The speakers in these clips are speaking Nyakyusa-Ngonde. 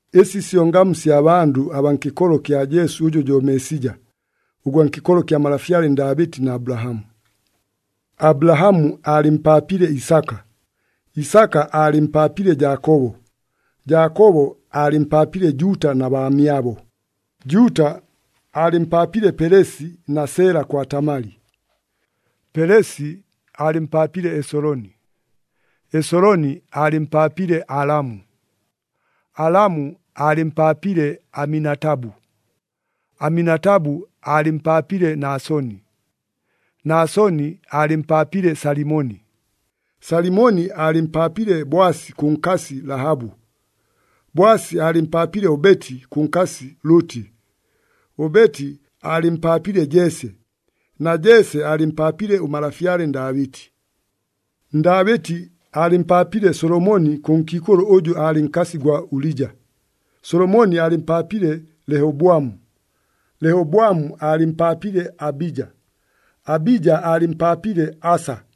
Ɨsi syo ngamu sya bandʉ abaa nkɨkolo kya Jesu ʉjʉ jo Meesija, ʉgwa nkɨkolo kya malafyale Ndaabɨti na Abulahamu. Abulahamu aalɨmpaapile Isaka, Isaka aalɨmpaapile Jaakobo, Jaakobo aalɨmpaapile Juuta na baamyabo. Juuta aalɨmpaapile Pelesi na Sela kwa Tamali. Pelesi aalɨmpaapile Esoloni, Esoloni aalɨmpaapile Alamu, Alamu aalɨmpaapile Aminatabu, Aminatabu aalɨmpaapile Nasoni, Nasoni aalɨmpaapile Salimoni, Salimoni aalɨmpaapile Boasi kʉ nkasi Lahabu, Boasi aalɨmpaapile Obeti kʉ nkasi Lʉtɨ, Obeti aalɨmpaapile Jese, na Jese aalɨmpaapile ʉmalafyale Ndaabɨti. Ndaabɨti aalɨmpaapile Solomoni kʉ nkiikʉlʉ ʉjʉ aalɨ nkasi gwa Ulija, Solomoni aalɨmpaapile Lehobwamu, Lehobwamu aalɨmpaapile Abija, Abija aalɨmpaapile Asa,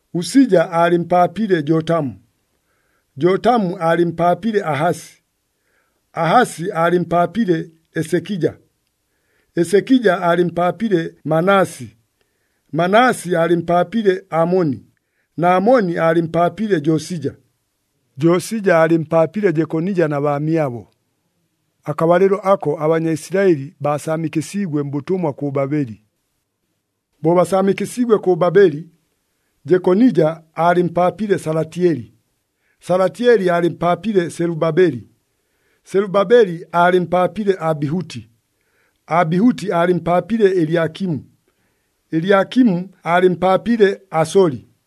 Usija aalɨmpaapile Jotamu, Jotamu aalɨmpaapile Ahasi, Ahasi aalɨmpaapile Esekija, Esekija aalɨmpaapile Manasi, Manasi aalɨmpaapile Amoni, na Amoni aalɨmpaapile Josija, Josija aalɨmpaapile Jekonija na baamyabo. Akabalɨlo ako aBanyaisilaɨli baasaamikɨsiigwe mbʉtʉmwa kʉ Babeli. Bo basaamikɨsiigwe kʉ Babeli, Jekonija aalɨmpaapile Salatyeli, Salatyeli aalɨmpaapile Selubabeli, Selubabeli aalɨmpaapile Abihuti, Abihuti aalɨmpaapile Elyakimu, Elyakimu aalɨmpaapile Asoli,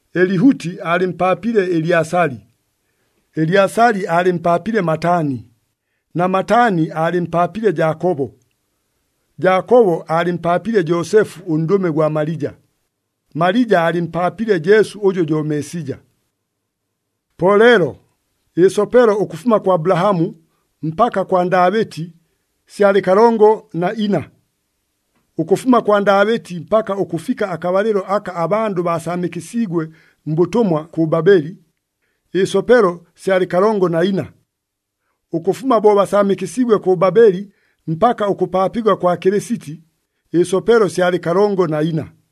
Elihuti aalɨmpaapile Elyasali, Elyasali aalɨmpaapile Matani, na Matani aalɨmpaapile Jaakobo. Jaakobo aalɨmpaapile Joosefu ʉndʉme gwa Malija. Malija aalɨmpaapile Jesu ʉjʉ jo Meesija. Po leelo, ɨsopelo ʉkʉfuma kwa Abulahamu mpaka kwa Ndaabɨti syalɨ kalongo na ina. Ʉkʉfuma kwa Ndaabɨti mpaka ʉkʉfika akabalɨlo aka abandʉ baasaamikɨsiigwe mbʉtʉmwa kʉ Babeli, ɨsopelo syalɨ kalongo na ina. Ʉkʉfuma bo basaamikɨsiigwe kʉ Babeli mpaka ʉkʉpaapigwa kwa Kɨlɨsiti, ɨsopelo syalɨ kalongo na ina.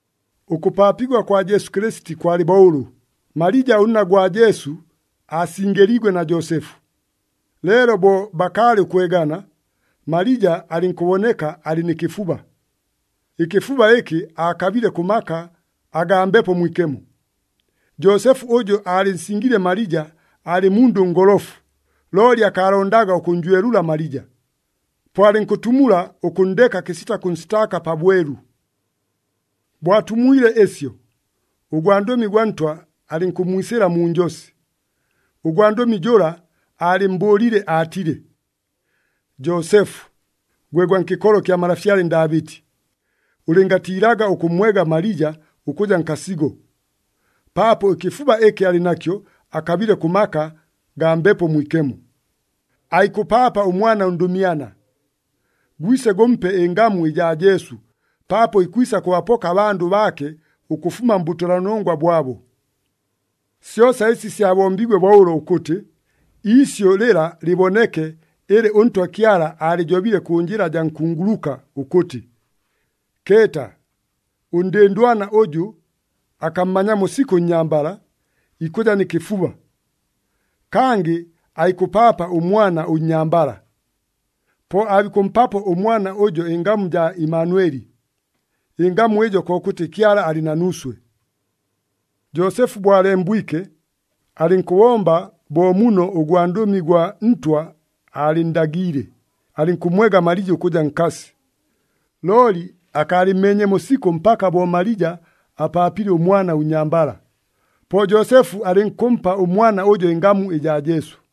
Ʉkʉpaapigwa kwa Jesu Kɨlɨsiti kwalɨ bo ʉlʉ, Malija ʉnna gwa Jesu aasingɨliigwe na Joosefu. Leelo bo bakaalɨ ʉkwegana, Malija alɨnkʉboneka alɨ nɨ kɨfuba. Ɨkɨfuba ɨkɨ aakabile kʉ maka agaa Mbepo Mwikemo. Joosefu ʉjʉ aalɨnsingiile Malija aalɨ mundʉ ngolofu, looli akaalondaga ʉkʉnnjwelʉla Malija. Po alɨnkʉtumula ʉkʉnndeka kɨsita kʉnsitaaka pabwelu. Bo atumwile ɨsyo, ʉgwandʉmi gwa Ntwa alɨnkʉmmwisɨla mu njosi. Ʉgwandʉmi jʉla aalɨmmbʉʉlile aatile, “Joosefu, gwe gwa nkɨkolo kya malafyale Ndaabɨti, ʉlɨngatiilaga ʉkʉmmwega Malija ʉkʉja nkasigo, paapo ɨkɨfuba ɨkɨ alɨ nakyo akabile kʉ maka agaa Mbepo Mwikemo. Aikʉpaapa ʉmwana ʉndʉmyana. Gwise gʉmpe ɨngamu ɨjaa Jesu, paapo ikwisa kʉbapoka abandʉ baake ʉkʉfuma mbʉtʉlanongwa bwabo.” Syosa ɨsi syabombiigwe bo ʉlo ʉkʉtɨ, iisyʉ lɨla lɨboneke ɨlɨ ʉNtwa Kyala aalɨjobile kʉ njɨla jaa nkunguluka ʉkʉtɨ, “Keeta! Ʉndɨndwana ʉjʉ akammanyamo sikʉ ʉnnyambala, ikʉja nɨ kɨfuba. Kangɨ aikʉpaapa ʉmwana ʉnnyambala! Po aabikʉmpapo ʉmwana ʉjo ɨngamu ɨjaa Imanweli.” Ɨngamu ɨjo kokʉtɨ, “Kyala alɨ na nuuswe.” Joosefu bo alembwike, alɨnkʉbomba bo muno ʉgwandʉmi gwa Ntwa aalɨnndagiile, alɨnkʉmmwega Malija ʉkʉja nkasi. Looli akaalɨmmeenyemo sikʉ mpaka bo Malija apaapile ʉmwana ʉnnyambala. Po Joosefu alɨnkʉmpa ʉmwana ʉjo ɨngamu ɨjaa Jesu.